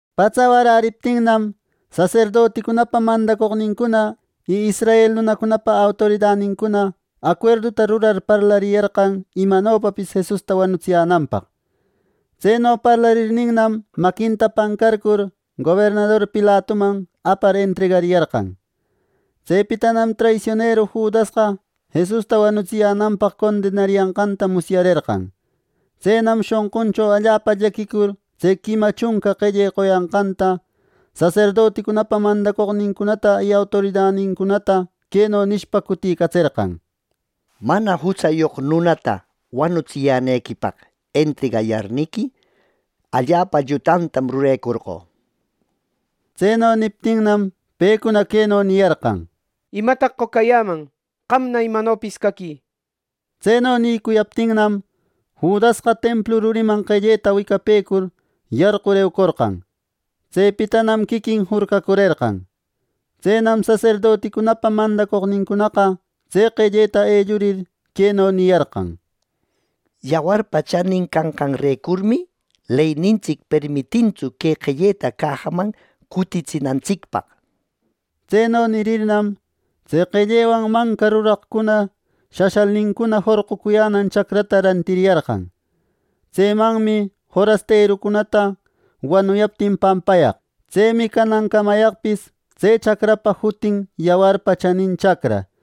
Patsa waräriptinnam, saserdoticunapa mandacoqnincuna y israel nunacunapa autoridanincuna acuerduta rurar, parlariyarqan imanopapis Jesusta wanutsiyänanpaq. Tseno parlarirnam, maquinta pancarcur gobernador Pilatuman apar entregariyarqan. Tsepitanam traisioneru Judasqa Jesusta wanutsiyänanpaq condenariyanqanta musyarerqan. Tsenam shonquncho allapa llaquicur tse quima chunca qelle qoyanqanta, saserdoticunapa mandacoqnincunata y autoridanincunata queno nishpa cutïcatserqan: —Mana jutsayoq nunata wanutsiyänequipaq entregayarniqui, allapa llutatam rurecorqö —nir. Tseno niptinnam, pecuna queno niyarqan: —¿Imataq qocayäman! ¡Qamna imanopis caquï! —nir. Tseno nïcuyaptinnam, Judasqa templu ruriman qelleta wicapecur, yarqur eucorqan. Tsepitanam quiquin jurcacurerqan. Tsenam saserdoticunapa mandacoqnincunaqa tse qelleta ellurir, queno niyarqan: —Yawarpa chanin canqanrecurmi leynintsic permitintsu que qelleta cajaman cutitsinantsicpaq —nir. Tseno nirirnam, tse qellewan manca ruraqcuna shashalnincuna jorqucuyänan chacrata rantiriyarqan. Tsemanmi forasterucunata wanuyaptin pampayaq. Tsemi canancamayaqpis tse chacrapa jutin Yawarpa Chanin Chacra.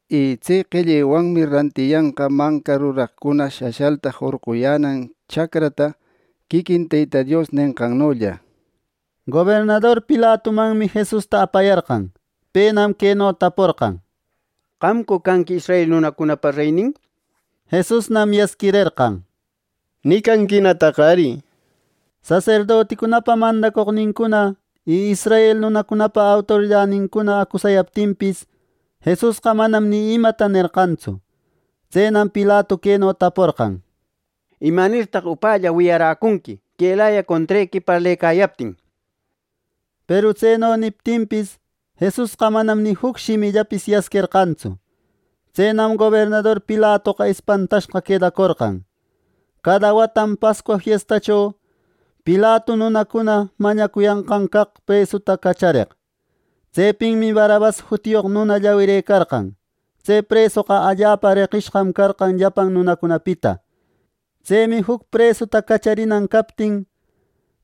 Y tse qellewanmi rantiyanqa manca ruraqcuna shashalta jorqucuyänan chacrata, quiquin Teyta Dios nenqannolla” nir. Gobernador Pilatumanmi Jesusta apayarqan. Penam queno taporqan: —¿Qamcu canqui israel nunacunapa reynin? —nir. Jesusnam yasquirerqan: —¡Nicanquinataq ari! —nishpa. Saserdoticunapa mandacoqnincuna y israel nunacunapa autoridanincuna acusayaptinpis, Jesusqa manam ni imata nerqantsu. Tsenam Pilatu queno taporqan: —¿Imanirtaq upälla wiyaräcunqui quelaya contrequi parlecayaptin! —nir. Peru tseno niptinpis, Jesusqa manam ni juc shimillapis yasquerqantsu. Tsenam gobernador Pilatoqa espantashqa quedacorqan. Cada watam Pascua fiestacho Pilatu nunacuna mañacuyanqan caq presuta cachareq. Tsepinmi Barrabas jutiyoq nuna llawirëcarqan. Tse presoqa allapa reqishqam carqan llapan nunacunapita. Tsemi juc presuta cacharinan captin,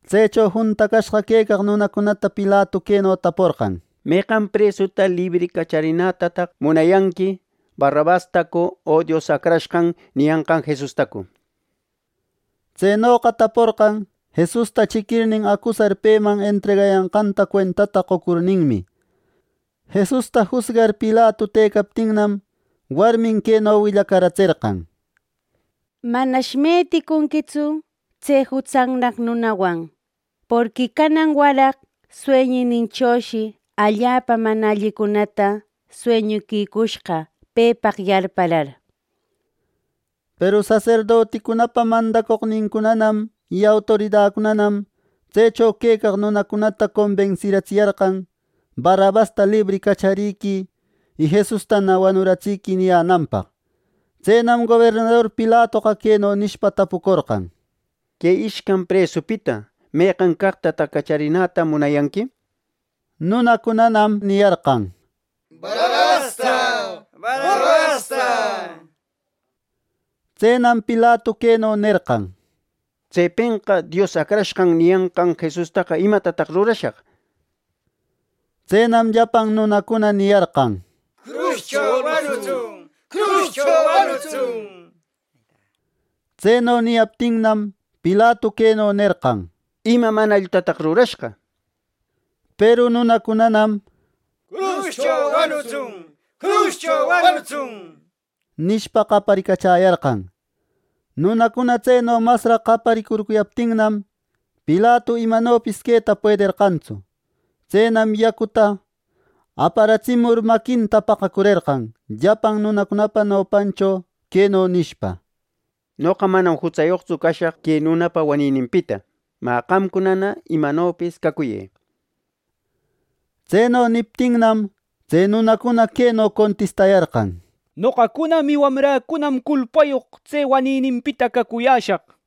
tsecho juntacashqa quecaq nunacunata Pilatu queno taporqan: —¿Meqan presuta libri cacharinätataq munayanqui, Barrabastacu o Dios Acrashqan niyanqan Jesustacu? —nir. Tsenoqa taporqan Jesusta chiquirnin, acusar peman entregayanqanta cuentata qocurninmi. Jesusta jusgar Pilatu tëcaptinnam, warmin queno willacaratserqan: —Manash meticunquitsu tse jutsannaq nunawan. Porqui canan waraq sueñininchoshi allapa mana allicunata sueñuquicushqa pepaq yarparar —nir. Peru saserdoticunapa mandacoqnincunanam y autoridacunanam tsecho quecaq nunacunata combensiratsiyarqan, “Barrabasta libri cacharïquï, y Jesustana wanuratsï” niyänanpaq Tsenam gobernador Pilatoqa queno nishpa tapucorqan: —Que ishcan presupita, ¿meqan caqtataq cacharinäta munayanqui? —nir. Nunacunanam “¡Barrabasta! ¡Barrabasta!” niyarqan. Tsenam Pilatu queno nerqan: —Tsepenqa ‘Dios Acrashqan niyanqan Jesustaqa, ¿Imatatan rurashaq?’ nir. Tsenam llapan nunacuna niyarqan: —¡Cruscho wanutsun! ¡Cruscho wanutsun! —nishpa. Tseno niyaptinnam, Pilatu queno nerqan: —¿Ima mana allitataq rurashqa? —nir. Peru nunacunanam “¡Cruscho wanutsun!” nishpa, qaparicachäyarqan. Nunacuna tseno masraq qaparicurcuyaptinnam, Pilatu imanopis queta puederqantsu. Tsenam yacuta aparatsimur, maquinta paqacurerqan llapan nunacunapa nopancho, queno nishpa: “Noqa manam jutsayoqtsu cashaq que nunapa wanininpita. ¡Mä, qamcunana imanopis cacuyë!” nir. Tseno niptinnam, tse nunacuna queno contistayarqan: —Noqacunam y wamräcunam culpayoq tse wanininpita cacuyäshaq —nir.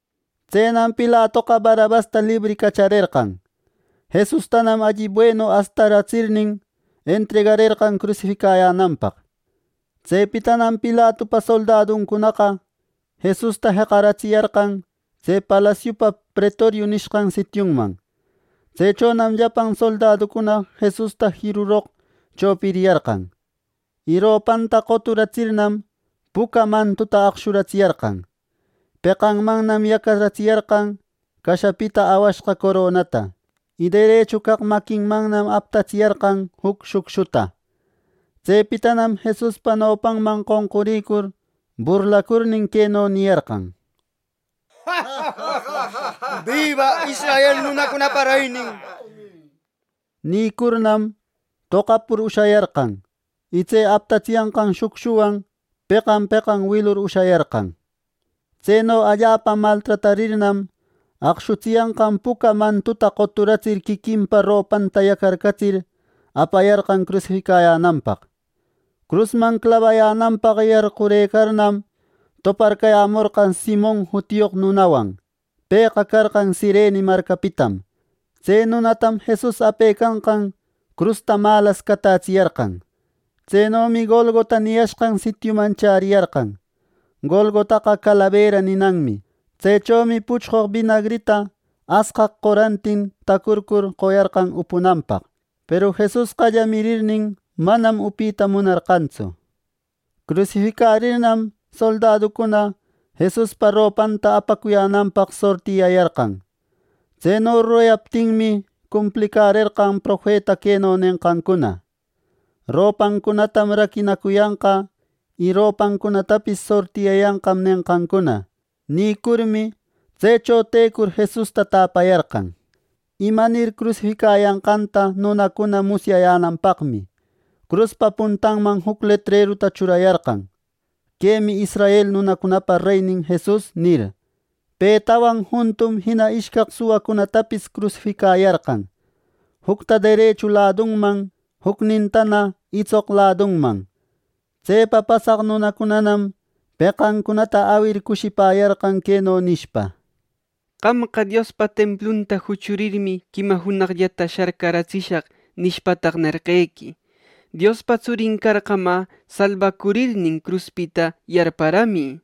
Tsenam Pilatoqa Barrabasta libri cacharerqan. Jesustanam alli buenu astaratsirnin, entregarerqan crusificayänanpaq. Tsepitanam Pilatupa soldaduncunaqa Jesusta jeqaratsiyarqan tse palasiupa Pretorio nishqan sitiuman. Tsechonam llapan soldaducuna Jesusta jiruroq chopiriyarqan. Y ropanta qoturatsirnam, puca mantuta aqshuratsiyarqan. Peqanmannam yacatsiyarqan cashapita awashqa coronata, y derechu caq maquinmannam aptatsiyarqan juc shucshuta. Tsepitanam Jesuspa nopanman qonqurïcur burlacurnin, queno niyarqan: —¡Biba israel nunacunapa reynin! —nir. Nïcurnam, toqapur ushayarqan, y tse aptatsiyanqan shucshuwan peqan peqan wilur ushayarqan. Tseno allapa maltratarirnam, aqshutsiyanqan puca mantuta qoturatsir quiquinpa ropantana yacarcatsir, apayarqan crusificayänanpaq. Crusman clabayänanpaq yarqurëcarnam, toparcayämorqan Simon jutiyoq nunawan. Pëqa carqan Cirene marcapitam. Tse nunatam Jesus apecanqan crusta malas catätsiyarqan. Tsenomi Golgota niyashqan sitiuman chäriyarqan (Golgotaqa “calabera” ninanmi). Tsechomi puchqoq binagrita asqaq qorantin tacurcur qoyarqan upunanpaq; peru Jesusqa llamirirnin, manam upita munarqantsu. Crusificarirnam soldaducuna Jesuspa ropanta apacuyänanpaq sortiyayarqan. ˻Tseno rurayaptinmi, cumplicärerqan profeta queno nenqancuna, “Ropäcunatam raquinacuyanqa, y ropäcunatapis sortiyäyanqam” nenqancuna.˼ Nïcurmi, tsecho tecur Jesusta täparäyarqan. Imanir crusificayanqanta nunacuna musyayänanpaqmi, cruspa puntanman juc letreruta churayarqan, “Quemi israel nunacunapa reynin Jesus” nir. Petawan juntum jina ishcaq suwacunatapis crusificayarqan, jucta derechu ladunman, jucnintana itsoq ladunman. Tsepa pasaq nunacunanam peqancunata awir cushipäyarqan, queno nishpa: —¡Qamqa, ‘Diospa templunta juchurirmi, quima junaqllata sharcatsishaq’ nishpataq, nerqequi! ¡Diospa tsurin carqa, mä, salbacurirnin cruspita yarparamï! —nir.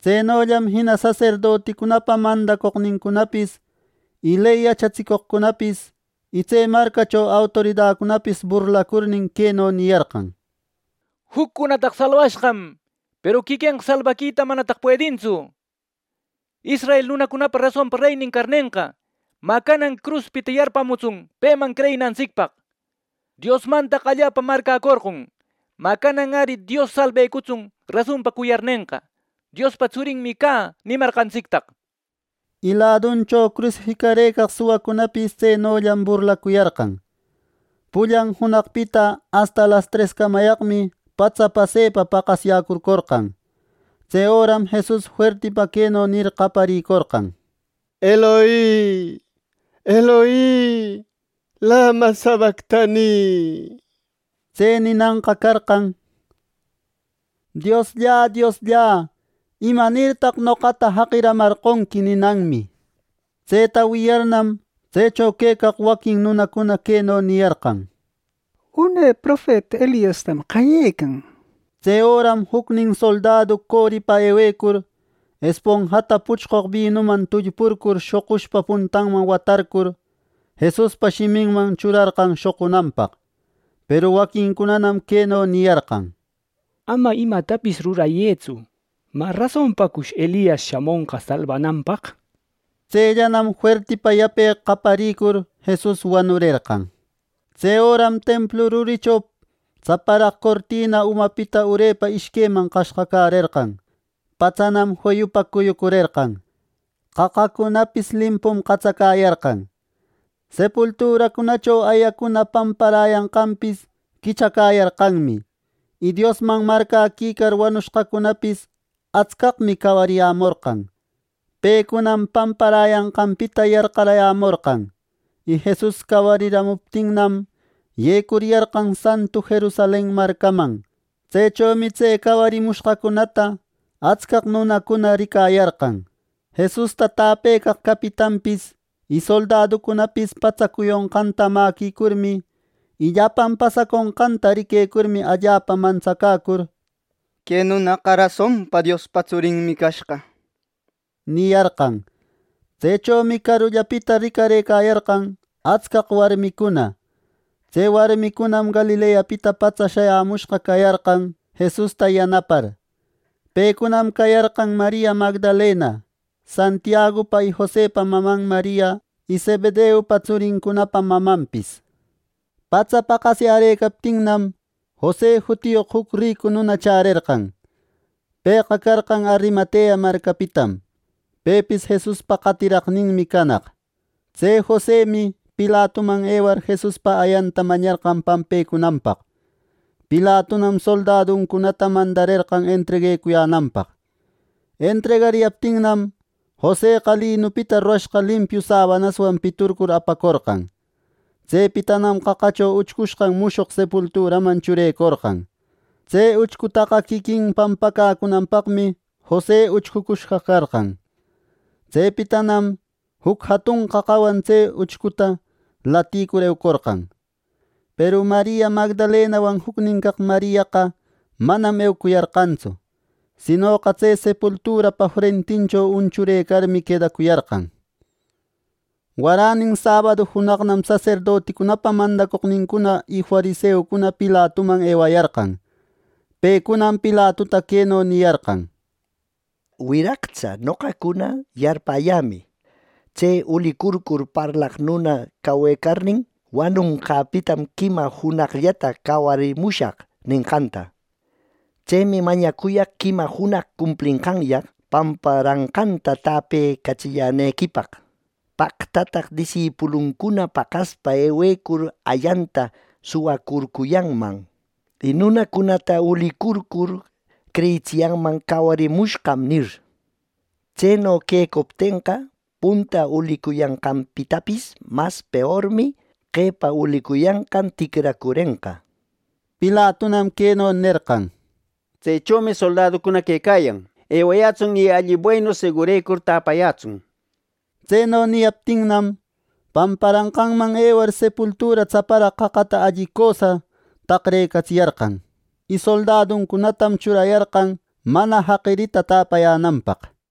Tsenollam jina saserdoticunapa mandacoqnincunapis, ley yachatsicoqcunapis y tse marcacho autoridacunapis burlacurnin, queno niyarqan: —Juccunataqa salbashqam; peru quiquenqa salbaquita ¡manataq puedintsu! Israel nunacunapa rasonpa reynin carnenqa, mä, canan cruspita yarpamutsun peman creyinantsicpaq. ¡Diosmantaq allapa marcäcorqon! ¡Mä, canan ari Dios salbecutsun rasonpa cuyarnenqa! ‘¡Diospa Tsurinmi cä’ nimarqantsictaq! Y laduncho crusificarëcaq suwacunapis tsenollam burlacuyarqan. Pullan junaqpita asta lastrescamayaqmi patsa pasepa paqasyäcurcorqan. Tse öram Jesus fuertipa queno nir qayarïcorqan: —Eloi, Eloi ¿lema sabactani? (Tse ninanqa carqan “Dios, Dios, ¿imanirtaq noqata jaqirïcamarqonqui?” ninanmi.) Tseta wiyarnam, tsecho quecaq waquin nunacuna queno niyarqan: —Une profeta Eliastam qayecan —nir. Tse öram jucnin soldadu coripa ewecur, esponjata puchqoq binuman tullpurcur, shoqushpa puntanman watarcur, Jesuspa shiminman churarqan shoqunanpaq. Peru waquincunanam queno niyarqan: —Ama imatapis rurayëtsu. ¿Mä, rasonpacush Elias shamonqa salbananpaq? —nir. Tsellanam fuertipa yape qayaricur, Jesus wanurerqan. Tse öram templu rurincho tsaparaq cortina umapita urepa ishqueman qashqacärerqan. Patsanam feyupa cuyucurerqan. Qaqacunapis limpum qatsacäyarqan. Sepulturacunacho ayacuna pamparäyanqanpis quichacäyarqanmi, y Diosman marcäquicar wanucushqacunapis atscaqmi cawariyämorqan. Pecunam pamparäyanqanpita yarqayämorqan, y Jesus cawariramuptinnam, yecuriyarqan santu Jerusalen marcaman. Tsechomi tse cawarimushqacunata atscaq nunacuna ricayarqan. Jesusta täpecaq capitanpis y soldaduncunapis patsa cuyonqanta mäquicurmi, y llapan pasaconqanta riquecurmi, allapa mantsacäcur, “¡Que nunaqa rasonpa Diospa Tsurinmi cashqa!” niyarqan. Tsechomi carullapita ricarëcayarqan atscaq warmicuna. Tse warmicunam Galileapita patsa shayämushqa cayarqan Jesusta yanapar. Pecunam cayarqan Maria Magdalena, Santiagupa y Josepa maman Maria y Zebedeupa tsurincunapa mamanpis. Patsa paqasyärëcaptinnam, Jose jutiyoq juc ricu nuna chärerqan. Pëqa carqan Arimatea marcapitam. Pepis Jesuspa qatiraqninmi canaq. Tse Josemi Pilatuman ewar, Jesuspa ayanta mañarqan pampecunanpaq. Pilatunam soldaduncunata mandarerqan entreguecuyänanpaq. Entregariyaptinnam, Joseqa linupita rurashqa limpiu sabanaswan piturcur apacorqan. Tsepitam qaqacho uchcushqa mushoq sepulturaman churecorqan. Tse uchcutaqa quiquin pampacäcunanpaqmi Jose uchcucushqa carqan. Tsepitanam juc jatun qaqawan tse uchcuta laticur, eucorqan. Peru Maria Magdalenawan jucnin caq Mariaqa manam eucuyarqantsu, sinoqa tse sepulturapa frentincho unchurëcarmi, quedacuyarqan. Waränin sabadu junaqnam saserdoticunapa mandacoqnincuna y fariseucuna Pilatuman ewayarqan. Pecunam Pilatuta queno niyarqan: —Wiraqtsa, noqacuna yarpäyämi, tse ulicurcur parlaq nuna cawecarnin ‘Wanonqäpitam quima junaqllata cawarimushaq’ nenqanta. Tsemi mañacuyaq quima junaq cumplenqanyaq pamparanqanta täpecatsillänequipaq. ¡Paqtataq disipuluncuna paqaspa ewecur ayanta suwacurcuyanman, y nunacunata ulicurcur creyitsiyanman ‘cawarimushqam’ nir! Tseno quecuptenqa, punta ulicuyanqanpitapis mas peormi qepa ulicuyanqan ticracurenqa —nir. Pilatunam queno nerqan: —Tsechomi soldaducuna quecayan. Ewayätsun y alli buenu segurecur täpayätsun —nir. Tseno niyaptinnam, pamparanqanman ewar, sepultura tsaparaq qaqata alli cösa taqrecatsiyarqan. Y soldaducunatam churayarqan mana jaqirita tapayänanpaq.